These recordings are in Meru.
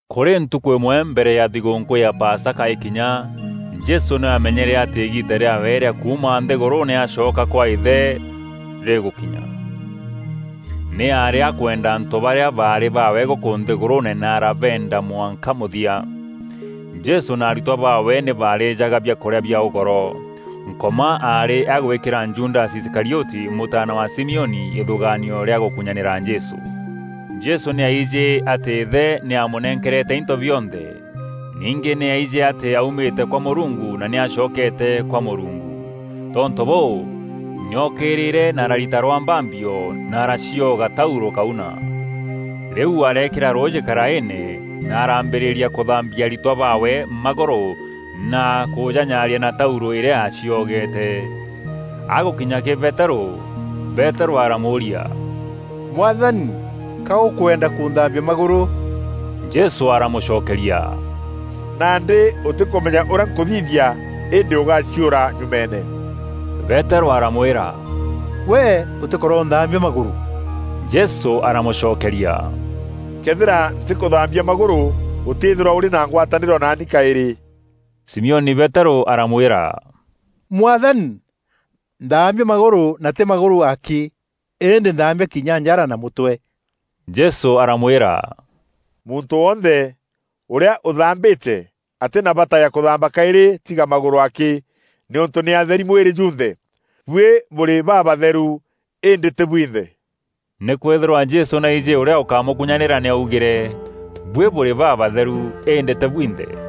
Kûrî ntukû îmwe mbere ya thigûûnkû ya Pasaka îkinya, Jesû nî aamenyere atî îgiita rîaawe rîa kuuma nthîgûrûûne acoka kwa Îthe rîgûkinya. Nî aarî akwenda antû barîa baarî baawe gûkû nthîgûrûûne na arabeenda mwanka mûthia. Jesû na aritwa baawe nî baarîjaga biakûrîa bia ûgoro. Nkoma aarî agwîkîra Judasi Iskarioti, mûtaana wa Simioni, îthûgaanio rîa gûkunyanîra Jesû. Jesû nî aijî atî Îthe nî aamûnenkerete into bionthe. Ningî nî aijî atî aaumîte kwa Mûrungu na nî aacokeete kwa Mûrungu. Tontû bûû, nî ookîrîre na ararita rwambambio na aracioga taurû kauna. Rîu areekîra rûûjî karaîîne na arambîrîria kûthambia aritwa baawe magûrû na kûjanyaaria na taurû îrîa aaciogeete. Agûkinya kîrî Peterû, Peterû aramûûria, “Mwathani, Ka ûkwenda kûnthaambia magûrû?” Jesû aramûcokeria, “Nandî ûtîkûmenya ûrîa nkûthithia îndî ûgaciûra nyumeene.” Peterû aramwîra, “Gwe ûtîkoronthaambia magûrû!” Jesû aramûcokeria, “Këethîra ntîkûthambia magûrû, ûtîîthîrwa ûrî na ngwatanîro naani kaîrî.” Simioni Peterû aramwîra, “Mwathani, nthaambia magûrû na tî magûrû akî, îndî nthaambia kinya njara na mûtwe.” Jesû aramwîra, “Muntû wonthe ûrîa ûthambîte, atî na bata ya kûthamba kaîrî tiga magûrû akî, nîûntû nî atheri mwîrî junthe. Buî bûrî babatheru, îndî tî bwinthe.” Nîkwîthîrwa Jesû nî aijî ûrîa ûkamûkunyanîra nî augîre: “Buî bûrî babatheru îndî tî bwinthe.”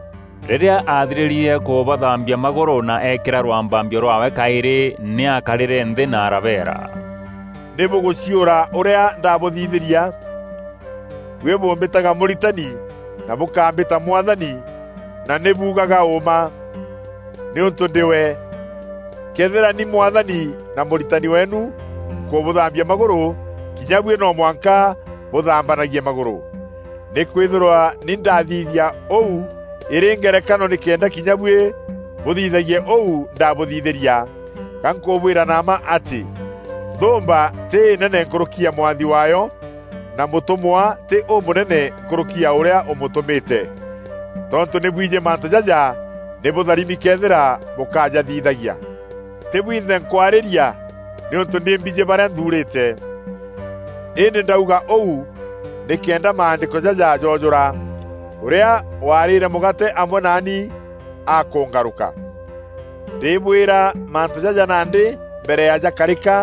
Rîrîa aathirîrie kûbathaambia magûrû na eekîra rwambambio rwaawe kaîrî nî aakarîre nthî na arabeera, “Nî bûgûciûra ûrîa ndabûthithîria? Buî bûmbîtaga Mûritani na bûkambîta Mwathani, na nî buugaga ûûma, nîûntû ndî we. Këethîra ni Mwathani na Mûritani weenu nkûbûthaambia magûrû, kinya buî no mwanka bûthaambanagie magûrû. Nîkwîthîrwa ni ndathithia ûu îrî ngerekano nîkenda kinya buî bûthithagia ûu ndaabûthithîria. Ga nkûbwîra na mma atî, nthûûmba tî înene nkûrûki ya mwathi waayo, na mûtûmwa tî ûmûnene nkûrûki ya ûrîa ûmûtûmîte. Tontû nî bwijî mantû jaja, nî bûtharimi këethîra bûkajathithagia. “Tî bwinthe nkwarîîria nîûntû nî mbijî barîa nthuurîte. Îndî ndauga ûu nîkenda Maandîko jaja joojûra: ‘Ûrîa waarîre mûgaate amwe naani akûngarûka.’ Ndîbwîra mantû jaja nandî mbere ya jakarîka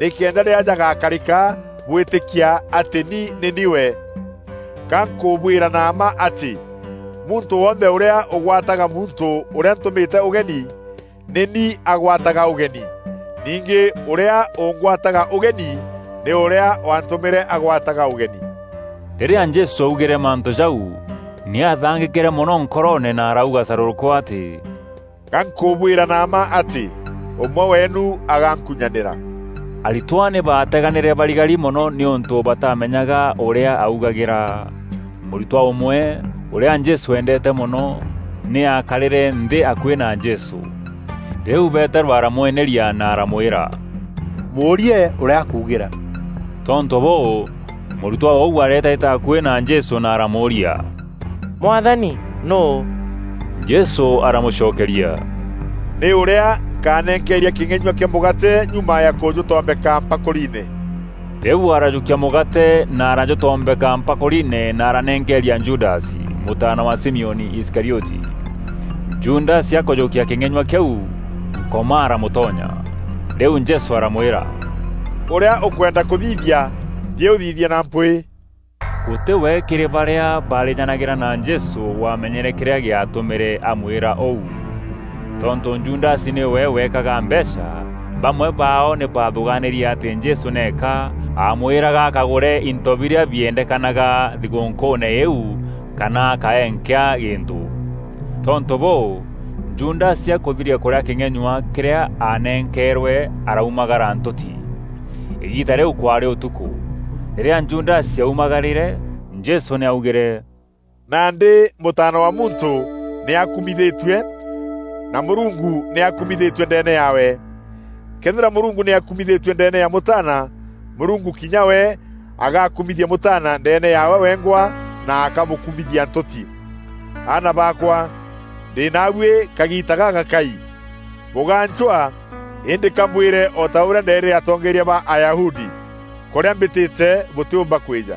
nîkenda rîrîa jagakarîka bwîtîkia atî ni nî ni we. Ga nkûbwîra na mma atî, muntû wonthe ûrîa ûgwataga muntû ûrîa ntûmîte ûgeni, nî ni agwataga ûgeni. Ningî ûrîa ûngwataga ûgeni nî ûrîa waantûmîre agwataga ûgeni.” Rîrîa Jesû aaugîre mantû jau, nî aathangîkîre mono nkoroone na arauga carûrûkû atî “Ga nkûbwîra na mma atî, ûmwe weenu agankunyanîra!” Aritwa nî baateganîre barigari mono nîûntû bataamenyaga ûrîa augagîra. Mûritwa ûmwe, ûrîa Jesû eendeete mono, nî aakarîre nthî akuî na Jesû. Rîu Peterû aramweneria na aramwîra, “Mûûrie ûrîa akuugîra.” Tontû bûû, mûritwa ûu areetaîta akuî na Jesû na aramûûria, “Mwathani, nûû?” Jesû aramûcokeria, “Nî ûrîa nkanenkeeria kîng'enyua kîa mûgaate nyuma ya kûjûtombeka mpakûriine.” Rîu arajûkia mûgaate na arajûtombeka mpakûriine na aranenkeeria Judasi, mûtaana wa Simioni Iskarioti. Judasi akûjûkia kîng'enyua kîu Nkoma aramûtonya. Rîu Jesû aramwîra, “Ûrîa ûkwenda kûthithia, nthiî ûthithie na mpwîî!” Gûtî we kîrî barîa baarîjanagîra na Jesû waamenyere kîrîa gîatûmîre amwîra ûu. Tontû Judasi nîwe weekaga mbeecha, bamwe baao nî baathûgaanîrie atî Jesû nîka aamwîraga akagûre into birîa biendekanaga thigûûnkûûne îîu kana akaee nkîa gîntû. Tontû bûû, Judasi akûthiria kûrîa kîng'enyua kîrîa aanenkeerwe araumagara ntûti. Îgiita rîu kwaarî ûtukû. Rîrîa Judasi aumagarîre, Jesû nî aaugîre, “Nandî Mûtaana wa Muntû nî akumithîtue, na Mûrungu nî akumithîtue ndeene yaawe. Këethîra Mûrungu nî akumithîtue ndeene ya Mûtaana, Mûrungu kinya we agakumithia Mûtaana ndeene yaawe wengwa, na akamûkumithia ntûti. “Aana baakwa, ndî naabuî kagiita gagakai. Bûgancwaa; îndî ka mbwîre o ta ûrîa ndeerîre atongeeria ba Ayahudi: ‘Kûrîa mbîtîte bûtîûmba kwîja.’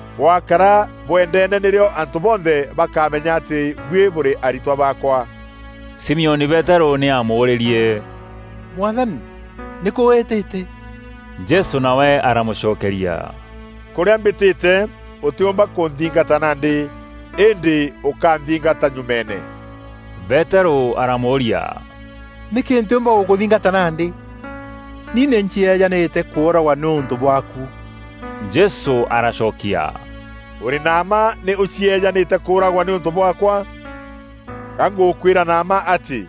Bwaakara bwendeene nîrîo antû bonthe bakamenya atî buî bûrî aritwa baakwa.” Simioni Peterû nî aamûûrîrie, “Mwathani, nîkû wîtîte?” Jesû nawe aramûcokeria, “Kûrîa mbîtîte, ûtîûmba kûnthingata nandî, îndî ûkanthingata nyumeene.” Peterû aramûûria, “Nîkî ntîûmba gûkûthingata nandî? Ni nî ncieejanîte kûûragwa nîûntû bwaaku!” Jesû aracokia, “Ûrî na mma nî ûcieejanîte kûûragwa nîûntû bwaakwa? Ga ngûkwîra na mma atî,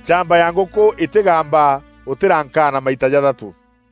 nchamba ya ngûkû îtîgamba, ûtîrankaana maita jathatû.”